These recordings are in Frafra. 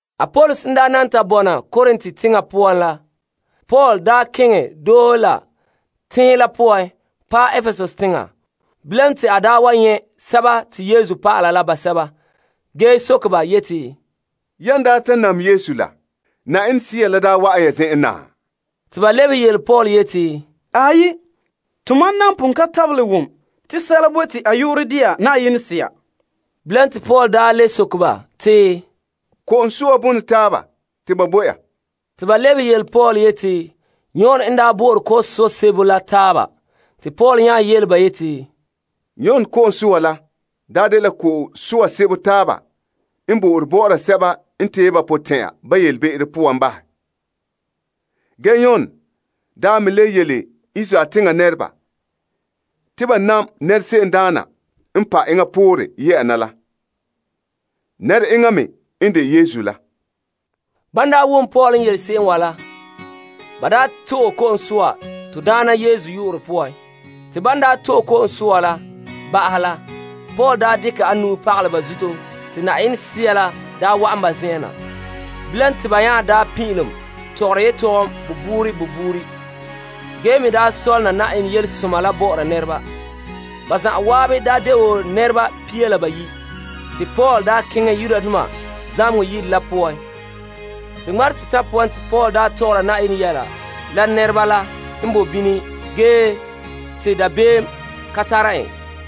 Apolos n daa na ta bɔna Korint teŋa poan la, Paul keŋɛ doohe la tenhen la poan paɛ Epesus teŋa. Bilam te a wa nyɛ' Yesu dɔlɔba la basɛba ge soke ba yeti, Yan daa ta nam Yesu la, Yenɛ Sea la wa'an ya zen'en na? Te ba lebehe Paul yeti, Tomam nan pon ka tabelɛ wom te sɛla boe te a yu'urɛ de'a Yenɛ Sea. Bilam te Paul le soke ba te, Ko'om soa bona taaba te ba bo ya? Te ba le lebehe yele Paul yeti, Yon n daa bo'ore ko'om soa sebo la taaba. Paul yele ba yeti, Yon ko'om soa la dela ko'om soa te ba bo'ore la sɛba n tee ba potɛn'ɛra ba be'em la poan. Ge Yon me le yele Israeldoma te ba nam nɛrese'em daana n pa' enŋa poore ye'a na la. Nɛre'enŋa me n de Yesu la. Ban wom Paul n yele ba se'em wa la, ba to'e ko'om soa to Daana Yesu yu'urɛ poan. Te Paul n ta dekɛ a nu'o pagalɛ ba zuto, te Yenɛ Sea la daa wa'an ba zen'en na te ba pin'ilom tɔgɔra yetɔgom buuri buuri ge me sɔlena Yenɛ Yelesoma la bo nɛreba. Ba zan'an de wo nɛra pia la bayi'. Paul daa keŋɛ zamehegɔ yire la poan te ŋmarehe setan' poan, a tɔgɔra Yenɛ sɔ'ɔlom yɛla la nɛreba la n boe bini ge te dabeem ka tara en.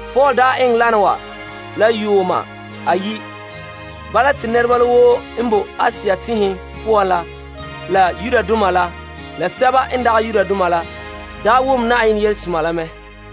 Paul eŋɛ wana wa la yuuma ayi' te nɛreba la woo n boe Asia tenhen poan la, la Yudoma la sɛba n dagɛ Yudoma la, wom Na'ayenɛ yelehom la mɛ.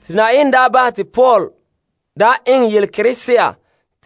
Yenɛ daa bahɛ te Paul eŋɛ yelekerese'a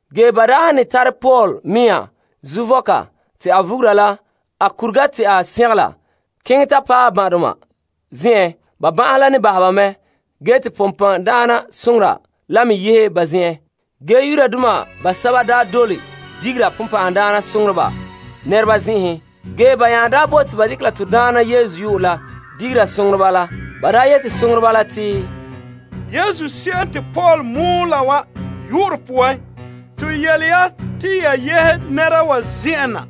ge ba han ne tare a nɛŋaduuhuga bii a tanɛ se'ere keŋɛ ta pagele ban'ahedoma zen'en ba ban'ahe la ne bahɛ ba mɛ ge te bonbɛ'ɛhe la me yehe ba zen'enhen. Yudoma basɛba n dole digera bonbɛ'ɛhe nɛreba zen'enhen nya bote te ba dekɛ la to Daana Yesu yu'urɛ digera soŋoreba la. Ba daa ne yeti, Yesu se'em te Paul mɔɔla wa yu'urɛ poan, to yele ya te ya yehe nɛra wa zen'en na.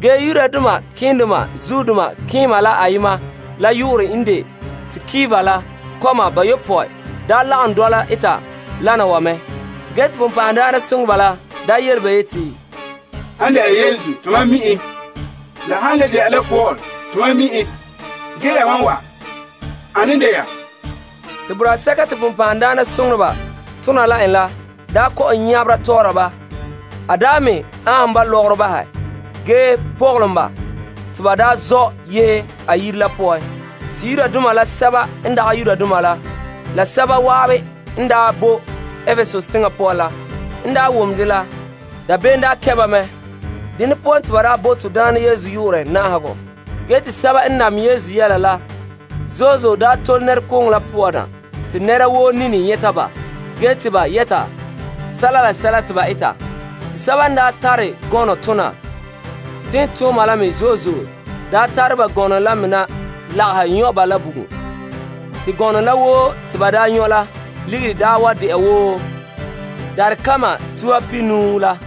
Te malema keema la ayema la yu'urɛ n de Skeva la kɔma bayopɔe lagom dɔla eta wana wa mɛ. Bonbɛ'ɛhe la yele ba yeti, Han de'a Yesu, tomam mi' en. La han de'a la Paul, tomam mi' en. Ge yamam wa, ane n de ya? Te boraa sɛka te bonbɛ'ɛhe tona la en la daa kɔ'ɔn nyabera tɔ'ɔra ba, aanhom ba lɔgɔrɔ bahɛ ge pɔgɔlom ba te ba zɔ' yehe a yire la poan. Yudoma la Greekdoma basɛba n boe Epesus teŋa poan la n wom dɛ la, dabeem kɛn' ba mɛ. Dene poan te ba bo to Daana Yesu yu'urɛ na'ahegɔ. Bama basɛba n nam Yesu la tole nɛrekooŋɔ la poan na te nɛra woo nini nyɛta ba ge te ba yɛta sɛla la sɛla te ba eta ge basɛba n daa tare gɔnɔ tona tiimtooma la me tare ba gɔnɔ la me na lagahɛ nyɔ' ba la bugum. Te gɔnɔ la woo te ba nyɔ' la ligiri daa de wo sanlenpɛɛle kpila tuha pihinuu la.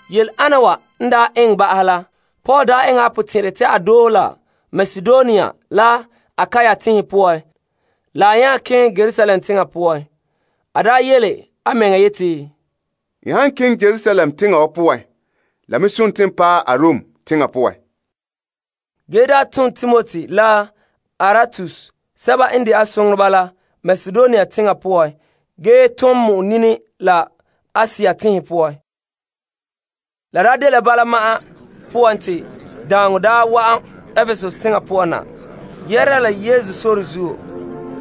Yele'ana wa n daa eŋɛ ba'ahɛ la, Paul eŋɛ a potɛn'ɛrɛ te a doohe la Makedonia la Akaia tenhen la nya keŋɛ Yerusalem teŋa poan. A yeti, N han keŋɛ Yerusalem teŋa wa poan la me sontii n paɛ Arom teŋa poan. Te a tom a soŋoreba Timoti la Erastus Makedonia teŋa ge enŋa ton mɔ'ɛn nini la Asia tenhen poan. La dela bala ma'an poan te daaŋɔ wa'an Epesus teŋa poan na yɛhera la Sore zuo.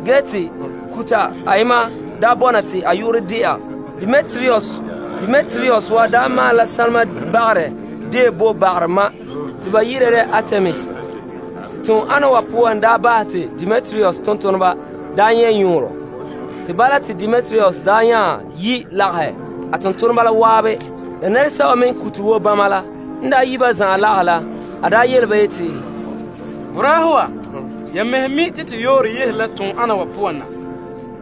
Ge te kuta ayema daa bɔna te a yu'urɛ de'a Demetrius. Demetrius wa maalɛ la sanlenpeela bagarɛ deo bo bagarɛ ma' te ba yi'ira dɛ Artemis. Te tom ana wa poan bahɛ te Demetrius tontoneba nyɛ' yɔɔrɔ. Te bala te Demetrius la nya daa yi' lagahɛ a tontoneba la zan'an la nɛresɛba me n kute wo bama la. N yi' ba zan'an lagahɛ la, a yele ba yeti, Boraahe wa. Ya mɛhe mi' te to yɔɔrɔ yehere la toondena wa poan na.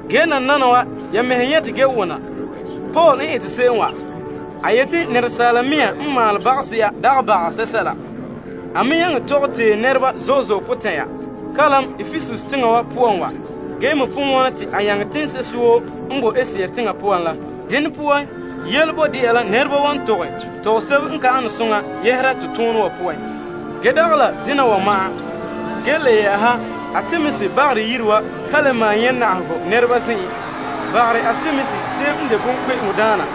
Ge nananawa ya mɛhe nyɛte ge wona Paul n ete se'em wa. A yete te asaala mea n maalɛ bagase'a dagɛ baga sɛsɛla. A me nyaŋɛ tɔgɛ tee nɛreba zo'e zo'e potɛn'ɛra kalam Epesus teŋa wa poan wa ge me pon wona te a nyaŋɛ teŋse'ehe woo n boe Asia teŋa poan la. Dene poan, yele boe de'a la nɛreba wan tɔgɛ tɔgɔsebo n ka an soŋa yɛhera la to toonɛ wa poan. Ge dagɛ la dena wa ma'an, ge le yɛ'ɛha Artemis bagarɛ yire wa ka le maan nyɛ' na'ahegɔ nɛreba zen'en. Bagarɛ Artemis se'em n de bonkpe'eŋo daana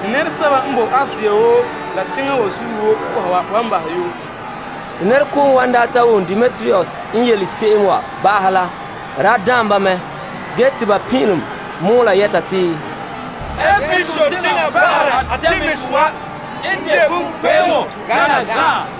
te nɛresɛba n bo Asia woo la teŋa wa zuo woo po'oha wa wan bahɛ yoo. Te nɛrekooŋɔ wa n daa ta wom Demetrius n yele ba se'em wa ba'ahɛ la, la daan ba. Ge te ba pin'ilom mɔɔla yɛta te, Epesus teŋa bagarɛ Artemis wa n de bonkpe'eŋo gana zan'an!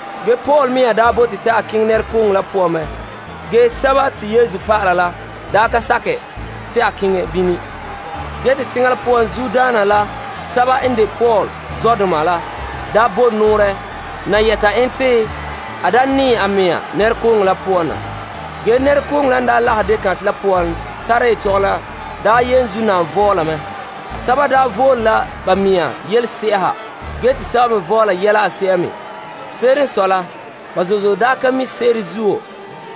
Paul mea me daa bote te a keŋɛ nɛrekooŋɔ la poan mɛ, ge Yesu dɔlɔba la ka sakɛ te a keŋɛ bini. Teŋa la poan zuodaana la basɛba n de Paul zɔdoma la me bo nɔɔrɛ na yɛta en te a da nɛɛ a mea nɛrekooŋɔ la poan na. Nɛrekooŋɔ la nya lagahɛ yetɔgom deo kantɛ la vɔɔla mɛ. Sɛba vole la ba me yelese'a ha ge te sɛba me vɔɔla yɛla a se'a me. Se'ere n sɔe la ba zo'e zo'e ka mi' se'ere zuo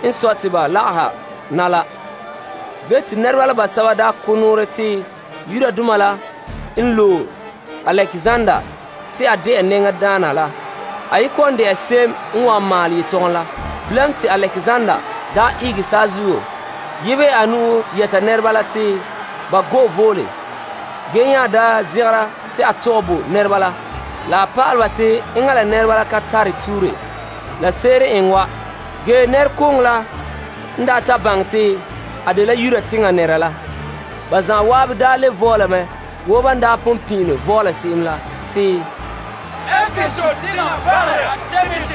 n sɔe te ba lagahɛ na la. Nɛreba la basɛba ko' nɔɔrɛ te Yudoma la n loe Alekzander te a de'a nɛŋadaana la, a ye kɔ'ɔn de'a se'em n wan maalɛ yetɔgom la. Bilam te Alekzander ihege saazuo yebehɛ a nu'o yɛta nɛreba la te ba go'e vole, ge nya zegera te a tɔgɛ bo nɛreba pa'alɛ ba te enŋa la nɛreba la ka tare tuure la se'ere n eŋɛ wa. Ge nɛrekooŋɔ la n ta baŋɛ te a dela Yudoma nɛra la, ba zan'an le vɔɔla mɛ wo ban pon pin'ilom vɔɔla se'em la te, Epesus teŋa bagarɛ Artemis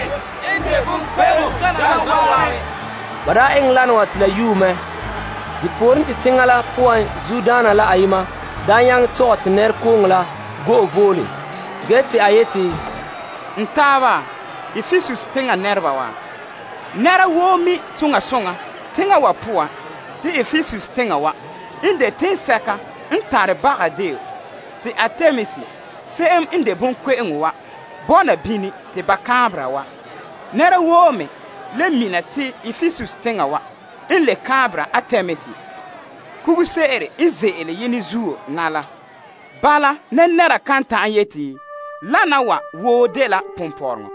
n de bonkpe'eŋo gana zan'an! Ba eŋɛ wana wa te la yue mɛ. Depooren te teŋa la poan zuodaana la ayema nyaŋɛ tɔgɛ te nɛrekooŋɔ la go'e vole. Ge te a yeti, N taaba Epesus teŋa nɛreba wa, nɛra woo mi' soŋa soŋa teŋa wa poan te Epesus teŋa wa n de toŋsɛka n tare baga deo te Artemis se'em n de bonkpe'eŋo wa bɔna bini te ba kaanbera wa. Nɛra woo me le mina te Epesus teŋa wa n le kaanbera Artemis kuguse'ere n ze'ele yenɛ zuo na la. Bala nɛnɛra kan ta'an yete lana wa woo dela ponpɔrɔŋɔ.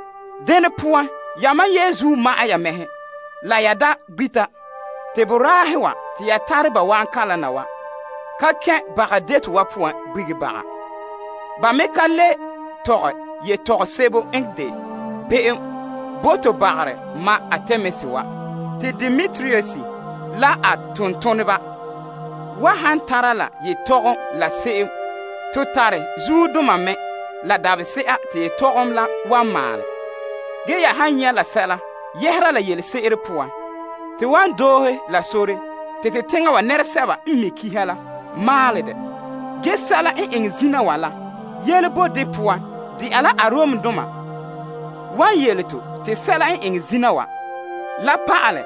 Dene poan yamam yenzuo ma'ɛn ya mɛhe la ya da gbita. Boraahe wa te ya tare ba wa'an kalam na wa ka kɛn' baga deto wa poan gbi baga. Ba me ka le tɔgɛ yetɔgom sebo n de be'em bo to bagarɛ ma' Artemis wa. Te Demetrius la a tontoneba wa han tara la yetɔgom la se'em, to tare zuodoma mɛ la dabahese'a te yetɔgom la wan maalɛ. Ya han nyɛ' la sɛla yɛhera la yelese'ere poan, to wan doohe la sore te teŋa wa nɛresɛba n mi' kiha la maalɛ dɛ. Ge sɛla n eŋɛ zina wa la, yele boe de poan de'a la Aromdoma wan yele to te sɛla n eŋɛ zina wa la pa'alɛ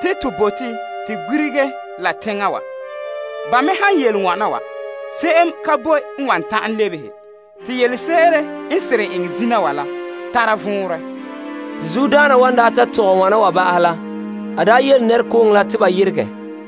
te to bote to gbirege la teŋa wa. Ban me han yele wana wa, se'em ka boe wan ta'an lebehe te yelese'ere n seren eŋɛ zina wa la, tare vɔnrɛ. Te zuodaana wa n daa ta tɔgɛ wana wa ba'ahɛ la, a daa yele nɛrekooŋɔ la te ba yeregɛ.